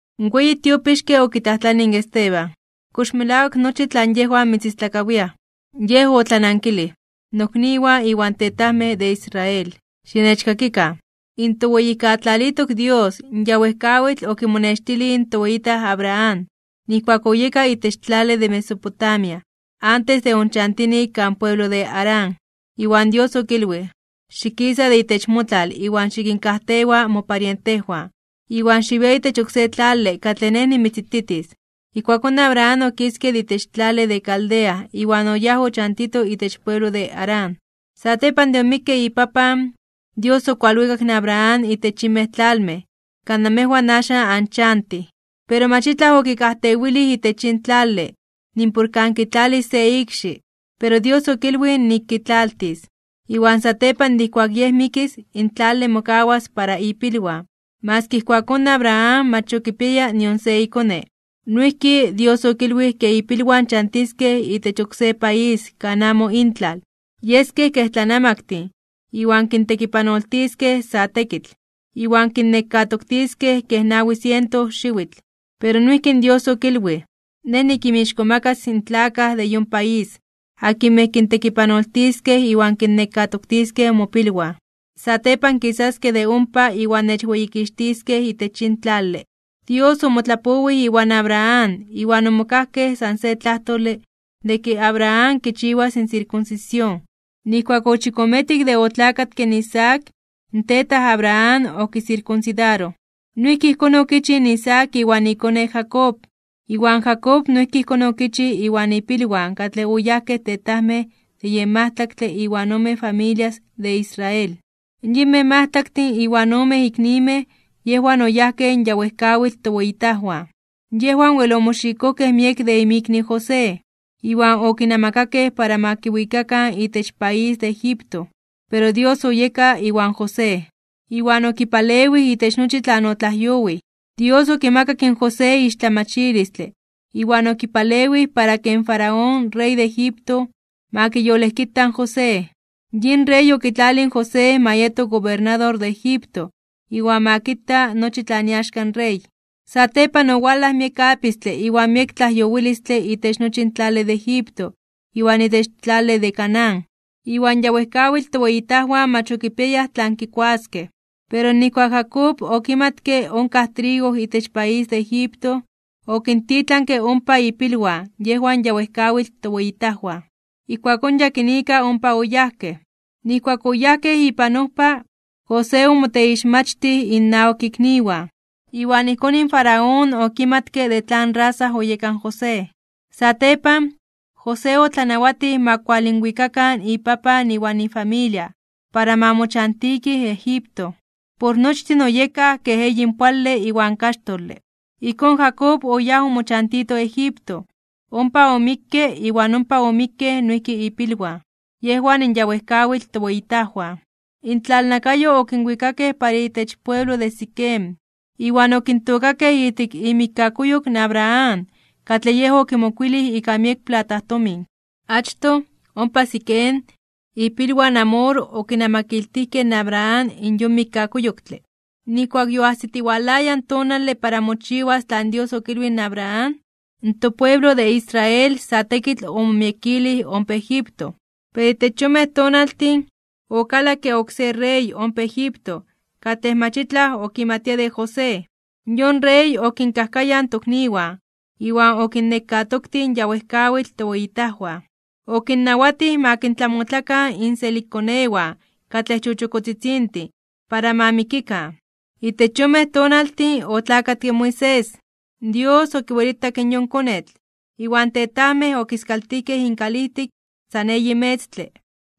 In weyi tiopixke okitlajtlanij in Esteban: ―¿Kox melawak nochi tlan yejwan mitzistlakawiaj? Yej otlanankilij: ―Nokniwan iwan tetajmej de Israel, xinechkakikan: In toWeyijkatlalitok Dios, ya wejkawitl okimonextilij in toweyitaj Abraham, nijkuak oyeka itech tlale de Mesopotamia, antes de onchantini kan pueblo de Harán, iwan Dios okilwij: “Xikisa de itech motlal iwan xikinkajtewa moparientejwan, iwan xiwia itech oksé tlale katlej Nej nimitzititis.” Ijkuakón Abraham okiske de itech tlale de Caldea iwan oyáj ochantito itech pueblo de Harán. Satepan de omikke ipapan, Dios okualwikak in Abraham itech yinmej tlalmej, kan namejwan axan anchantij. Pero mach itlaj okikajtewilij itech yin tlale, nimpor kan kitlalis se ikxi. Pero Dios okilwij nik kitlaltis, iwan satepan de ijkuak yej mikis in tlale mokawas para ipilwan, maski ijkuakón in Abraham mach ya okipiaya nion se ikone. Noijki, Dios okilwij ke ipilwan chantiskej itech oksé país kan amo intlal, yeskej kej tlanamaktin iwan kintekipanoltiskej sa tekitl, iwan kinnekatoktiskej kej nawi siento xiwitl. Pero noijki Dios okilwij: “Nej nikinmixkomakas (kintzonmanas) in tlakaj de yon país akinmej kintekipanoltiskej iwan kinnekatoktiskej mopilwan. Satepan kisaskej de ompa iwan nechweyikixtiskej itech yin tlale.” Dios omotlapowij iwan Abraham iwan omokajkej san se tlajtole de ke Abraham kichiwas in sirkunsisión. Nijkuak ochikometik de otlakatke in Isaac, in tetaj Abraham okisirkunsidaroj. Noijki ijkón okichij in Isaac iwan ikone Jacob, iwan Jacob noijki ijkón okichij iwan ipilwan katlej oyajkej tetajmej de yen majtlaktle iwan ome familias de Israel. ’Yinmej majtlaktin iwan omen iknimej yejwan oyajkej in ya wejkawitl toweyitajwan, yejwan wel omoxikojkej miek de inmikni José, iwan okinamakakej para ma kiwikakan itech país de Egipto. Pero Dios oyeka iwan José, iwan okipalewij itech nochi tlan otlajyowij. Dios okimakak in José ixtlamachilistle iwan okipalewij para ke in Faraón rey de Egipto, ma kiyolejkita in José. Yin rey okitlalij in José ma yeto gobernador de Egipto iwan ma kita nochi tlan iaxka in rey. ’Satepan owalaj miek apistle iwan miek tlajyowilistle itech nochi in tlale de Egipto iwan itech tlale de Canaán, iwan ya wejkawitl toweyitajwan mach okipiayaj tlan kikuaskej. Pero nijkuak in Jacob okimatke onkaj trigo itech país de Egipto, okintitlanke ompa ipilwan yejwan in ya wejkawitl toweyitajwan. Ijkuakón yakinika ompa oyajkej. Nijkuak oyajkej ipan ojpa, José omoteixmachtij inawak ikniwan, iwan ijkón in Faraón okimatke de tlan rasa oyeka in José. Satepan, José otlanawatij ma kualinwikakan ipapan iwan ifamilia, para ma mochantitij Egipto. Por nochtin oyekaj kej eyinpoale iwan kaxtole. Ijkón, Jacob oyáj omochantito Egipto, ompa omikke iwan ompa omikkej noijki ipilwan, yejwan in ya wejkawitl toweyitajwan. Intlalnakayo okinwikakej para itech pueblo de Siquem, iwan okintookakej ijtik imikkakuyok in Abraham katlej yej okimokowij ika miek platajtomin. Achtoj, ompa Siquem ipilwan in Hamor okinamakiltijkej in Abraham in yon mikkakuyoktle. ’Nijkuak yoajsitiwalaya in tonale para mochiwas tlan Dios okilwij in Abraham, topueblo de Israel sa tekitl omomiekilij ompa Egipto. Pero itech yonmej tonaltin, okalakke oksé rey ompa Egipto katlej mach itlaj okimatia de José. Yon rey okinkajkayaj tokniwan iwan okinnekatoktij in ya wejkawitl toweyitajwan, okinnawatij ma kintlamotlakan inselikkonewan katlej chochokotzitzintin para ma mikikan. Itech yonmej tonaltin otlakatke Moisés. Dios okiwelitak in yon konetl, iwan tetajmej okiskaltijkej inkalijtik san eyi metztle.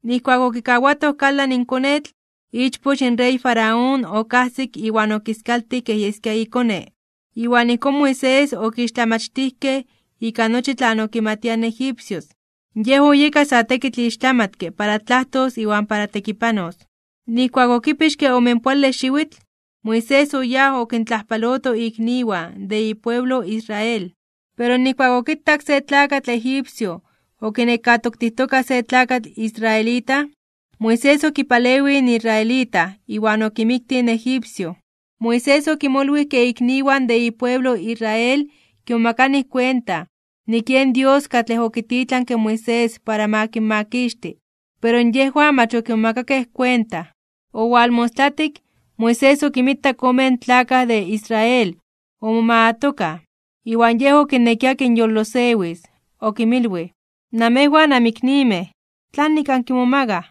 Nijkuak okikawatoj kalan in konetl, ichpoch in rey Faraón okajsik iwan okiskaltij kej yeskia ikone. Iwan ijkón Moisés okixtlamachtijkej ika nochi tlan okimatiaj in egipcios, yej oyeka sa tekitl ixtlamatke para tlajtos iwan para tekipanos. ’Nijkuak okipixke omenpoale xiwitl, Moisés oyáj okintlajpaloto ikniwan de ipueblo Israel. Pero nijkuak okitak se tlakatl egipcio okinekatoktijtoka se tlakatl israelita, Moisés okipalewij in israelita iwan okimiktij in egipcio. Moisés okimolwij ke ikniwan de ipueblo Israel kimomakanij kuenta, nik yen Dios katlej okititlanke in Moisés para ma kinmakixti, pero yejwan mach okimomakakej kuenta. Omostlatik, Moisés okinmitak omen tlakaj de Israel omomagatokaj, iwan yej okinekia kinyolosewis, okinmilwij: “Namejwan anmiknimej, ¿tlanik ankimomagaj?”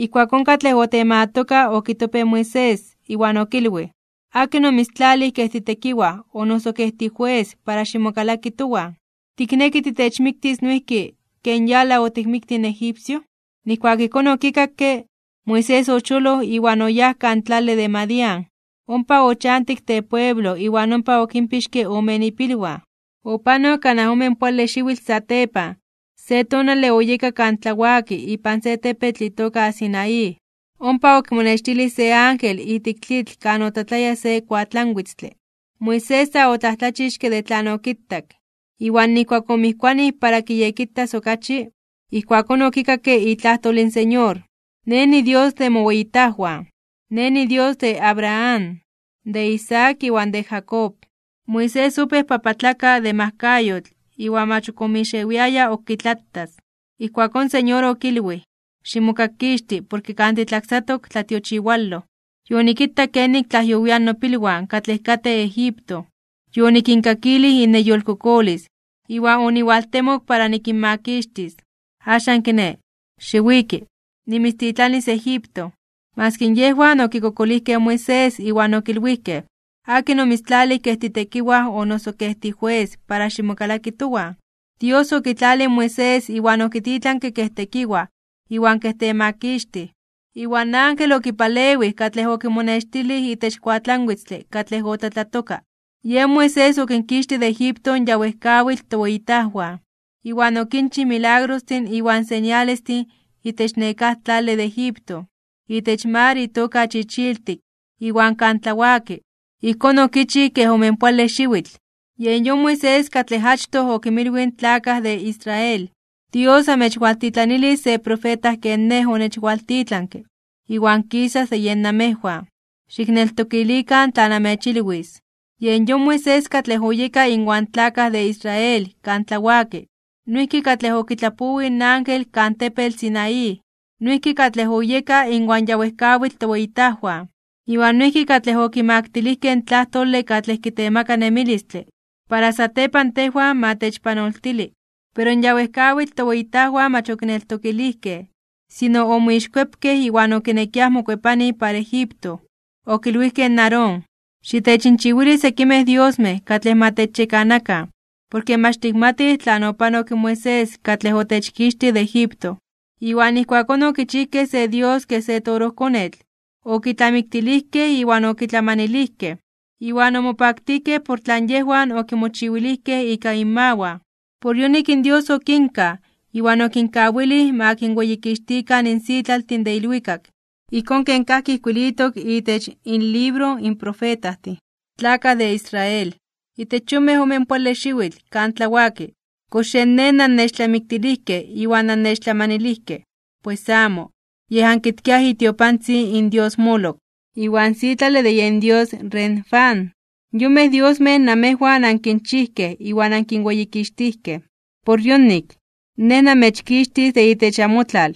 Ijkuakón katlej otemagatoka okitopej in Moisés, iwan okilwij: “¿Akin omitztlalij kej titekiwaj o noso kej tijues para ximokalaki towan? ¿Tikneki tinechmiktis noijki, ken yala otikmiktij in egipcio?” Nijkuak ijkón okikakke, Moisés ocholoj iwan oyáj kan tlale de Madián. Ompa ochantik tepueblo iwan ompa okinpixke ome ipilwan. ’Opanok kanaj omenpoale xiwitl satepan, se tonale oyeka kan tlawaki ipan se tepetl itoka Sinaí, ompa okimonextilij se ángel ijtik tlitl kan otlatlaya se kuatlanwitztle. Moisés sa otlajtlachixke (omomajmawtij) de tlan okitak, iwan nijkuak omijkuanij para kiyekitas okachi, ijkuakón okikakke itlajtol in Señor: “Nej niDios de moweyitajwan. Nej niDios de Abraham, de Isaac iwan de Jacob.” Moisés opéj papatlaka (bibioka) de majkayotl iwan mach ok omixewiaya ok kitlatas. Ijkuakón in Señor okilwij: “Ximokakkixti porke kan titlaksatok tlatiochiwaloj. Yonikitak kenik tlajyowiaj nopilwan katlej katej Egipto. Yonikinkakilij inneyolkokolis iwan oniwaltemok para nikinmakixtis. Axan kiné, xiwiki, nimitztitlanis Egipto.” ’Maski yejwan okikokolijkej in Moisés iwan okilwijkej: “¿Akin omitztlalij kej titekiwaj o noso kej tijues para ximokalaki towan?” Dios okitlalij in Moisés iwan okititlanke kej tekiwaj iwan kej temakixtij, iwan ángel okipalewij katlej okimonextilij itech kuatlanwitztle katlej otlatlatoka. Yen Moisés okinkixtij de Egipto in ya wejkawitl toweyitajwan, iwan okinchij milagrostin iwan señalestin itech nekáj tlale de Egipto, itech mar itoka Chichiltik iwan kan tlawaki, ijkón okichij kej omenpoale xiwitl. Yen yon Moisés katlej achtoj okinmilwij in tlakaj de Israel: “Dios anmechwaltitlanilis se profeta ken nej onechwaltitlanke, iwan kisas de yen namejwan. Xikneltokilikan tlan amechilwis.” Yen yon Moisés katlej oyeka inwan tlakaj de Israel kan tlawaki, noijki katlej okitlapowij in ángel kan tepetl Sinaí, noijki katlej oyeka inwan ya wejkawitl toweyitajwan, iwan noijki katlej okimaktilijkej in tlajtole katlej kitemaka nemilistle, para satepan tejwan ma techpanoltili. ’Pero in ya wejkawitl toweyitajwan mach okineltokilijkej, sino omixkuepkej iwan okinekiaj mokuepanij para Egipto. Okilwijkej in Aarón: “Xitechinchiwili sekimej diosmej katlej ma techyekanakan, porke mach tikmatij tlan opanok in Moisés katlej otechkixtij de Egipto.” Iwan ijkuakón okichijkej se dios kej se torojkonetl, okitlamiktilijkej iwan okitlamanilijkej. Iwan omopaktijkej por tlan yejwan okimochiwilijkej ika inmawan. Por yonik Dios okinkaj, iwan okinkawilij ma kinweyikixtikan in sitlaltin de ilwikak. Ijkón ken kajki ijkuilitok itech inlibro in profetajtin: Tlakaj de Israel, ¿itech yonmej omenpoale xiwitl kan tlawaki kox yen Nej nannechtlamiktilijkej iwan nannechtlamanilijkej? Pues amo, yej ankitkiaj itiopantzin in dios Moloc iwan sitlale de yen dios Renfán. Yonmej diosmej namejwan ankinchijkej iwan ankinweyikixtijkej. Por yonik, Nej namechkixtis de itech amotlal,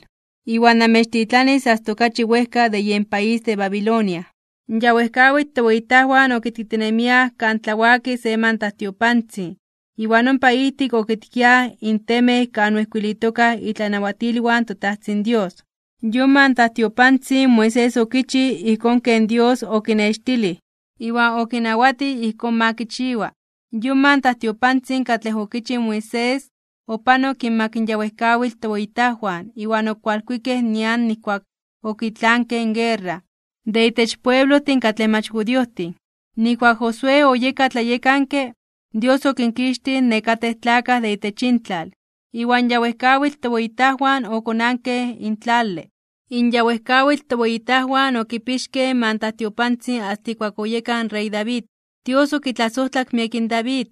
iwan namechtitlanis asta okachi wejka de yen país de Babilonia. ’In ya wejkawitl toweyitajwan okitkitinemiaj kan tlawaki se mantajtiopantzin iwan ompa ijtik okitkiaj in temej kan oijkuilitoka itlanawatilwan in toTajtzin Dios. Yon mantajtiopantzin Moisés okichij ijkón ken Dios okinextilij iwan okinawatij ijkón ma kichiwa. Yon mantajtiopantzin katlej okichij Moisés, opanok inmak in ya wejkawitl toweyitajwan iwan okualkuikej nian nijkuak okitlankej in guerra de itech pueblojtin katlej mach judiojtin. Nijkuak Josué oyeka tlayekanke, Dios okinkixtij nekatej tlakaj de itech intlal, iwan ya wejkawitl toweyitajwan okonankej in tlale. In ya wejkawitl toweyitajwan okipixkej in mantajtiopantzin asta ijkuak oyeka in rey David. Dios okitlasojtlak miek in David.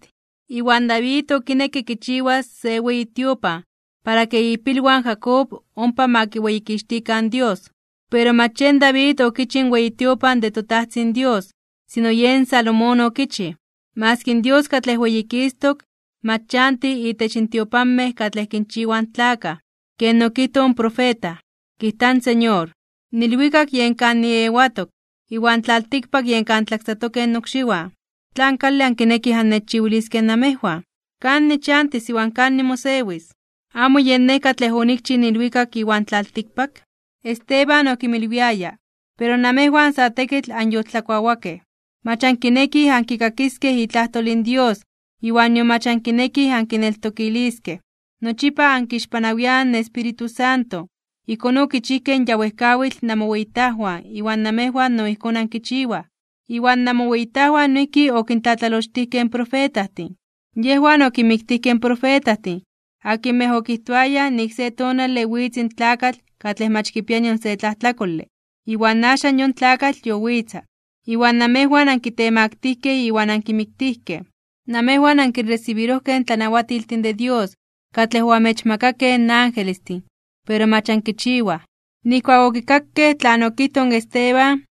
Iwan David okinekke kichiwas se weyi tiopan para ke ipilwan in Jacob ompa ma kiweyikixtikan in Dios. Pero mach yen David okichij in weyi tiopan de toTajtzin Dios, sino yen Salomón okichij. Maski in Dios katlej Weyikistok (Weyititok) mach chanti itech tiopanmej katlej kinchiwaj in tlakaj. Ken okijtoj in profeta: Kijta in Señor, In ilwikak yen kan niewatok iwan in tlaltikpak yen kan tlaksatokej nokxiwan. ¿Tlan kale ankinekij annechchiwiliskej namejwan? ¿Kan nichantis iwan kan nimosewis? ¿Amo yen Nej katlej onikchij in ilwikak iwan tlaltikpak? Esteban okinmilwiaya: ―Pero namejwan sa tekitl anyoltlakuawakej. Mach ankinekij ankikakiskej itlajtol in Dios iwan nion mach ankinekij ankineltokiliskej. Nochipa ankixpanawiaj in Espíritu Santo, ijkón okichijkej in ya wejkawitl namoweyitajwan iwan namejwan no ijkón ankichiwaj. Iwan namoweyitajwan noijki okintlatlalochtijkej in profetajtin. Yejwan okinmiktijkej in profetajtin akinmej okijtoayaj nik se tonale witz in tlakatl katlej mach kipia nion se tlajtlakole, iwan axan yon tlakatl yowitza, iwan namejwan ankitemaktijkej (onkitemaktilijkej) iwan ankimiktijkej. Namejwan ankiresibirojkej in tlanawatiltin de Dios katlej oamechmakakej in angelestin, pero mach ankichiwaj. Nijkuak okikakej tlan okijtoj in Esteban,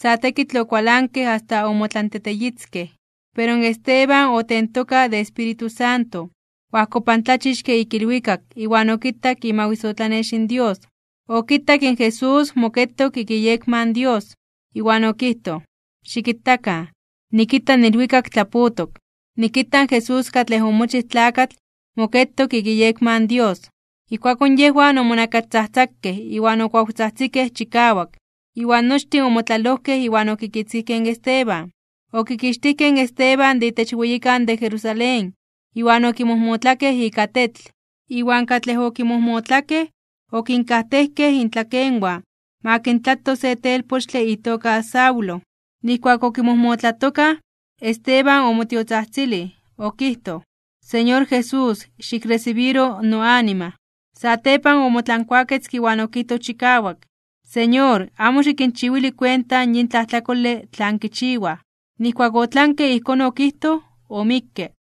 sa tekitl okualankej asta omotlanteteyitzkej. Pero in Esteban otentoka de Espíritu Santo, oajkopantlachixke ik ilwikak iwan okitak imawisotlanex in Dios. Okitak in Jesús moketok ik iyekma in Dios. Iwan okijtoj: ―Xikitakan, nikita in ilwikak tlapotok. Nikita in Jesús katlej omochij tlakatl moketok ik iyekma in Dios. Ijkuakón yejwan omonakastzajtzakej iwan okuawtzajtzikej chikawak, iwan nochtin omotlalojkej iwan okikitzkijkej in Esteban. Okixtijkej in Esteban de itech weyikan de Jerusalén iwan okimojmotlakej ika tetl. Iwan katlej okimojmotlakej okinkajtejkej intlakenwan ma kintlato se telpochtle itoka Saulo. Nijkuak okimojmotlatokaj, Esteban omotiotzajtzilij, okijtoj: ―Señor Jesús, xikresibiro noanima. Satepan omotlankuaketzke iwan okijtoj chikawak: ―Señor, amo xikinchiwili kuenta yin tlajtlakole tlan kichiwaj. Nijkuak otlanke ijkón okijtoj, omikke.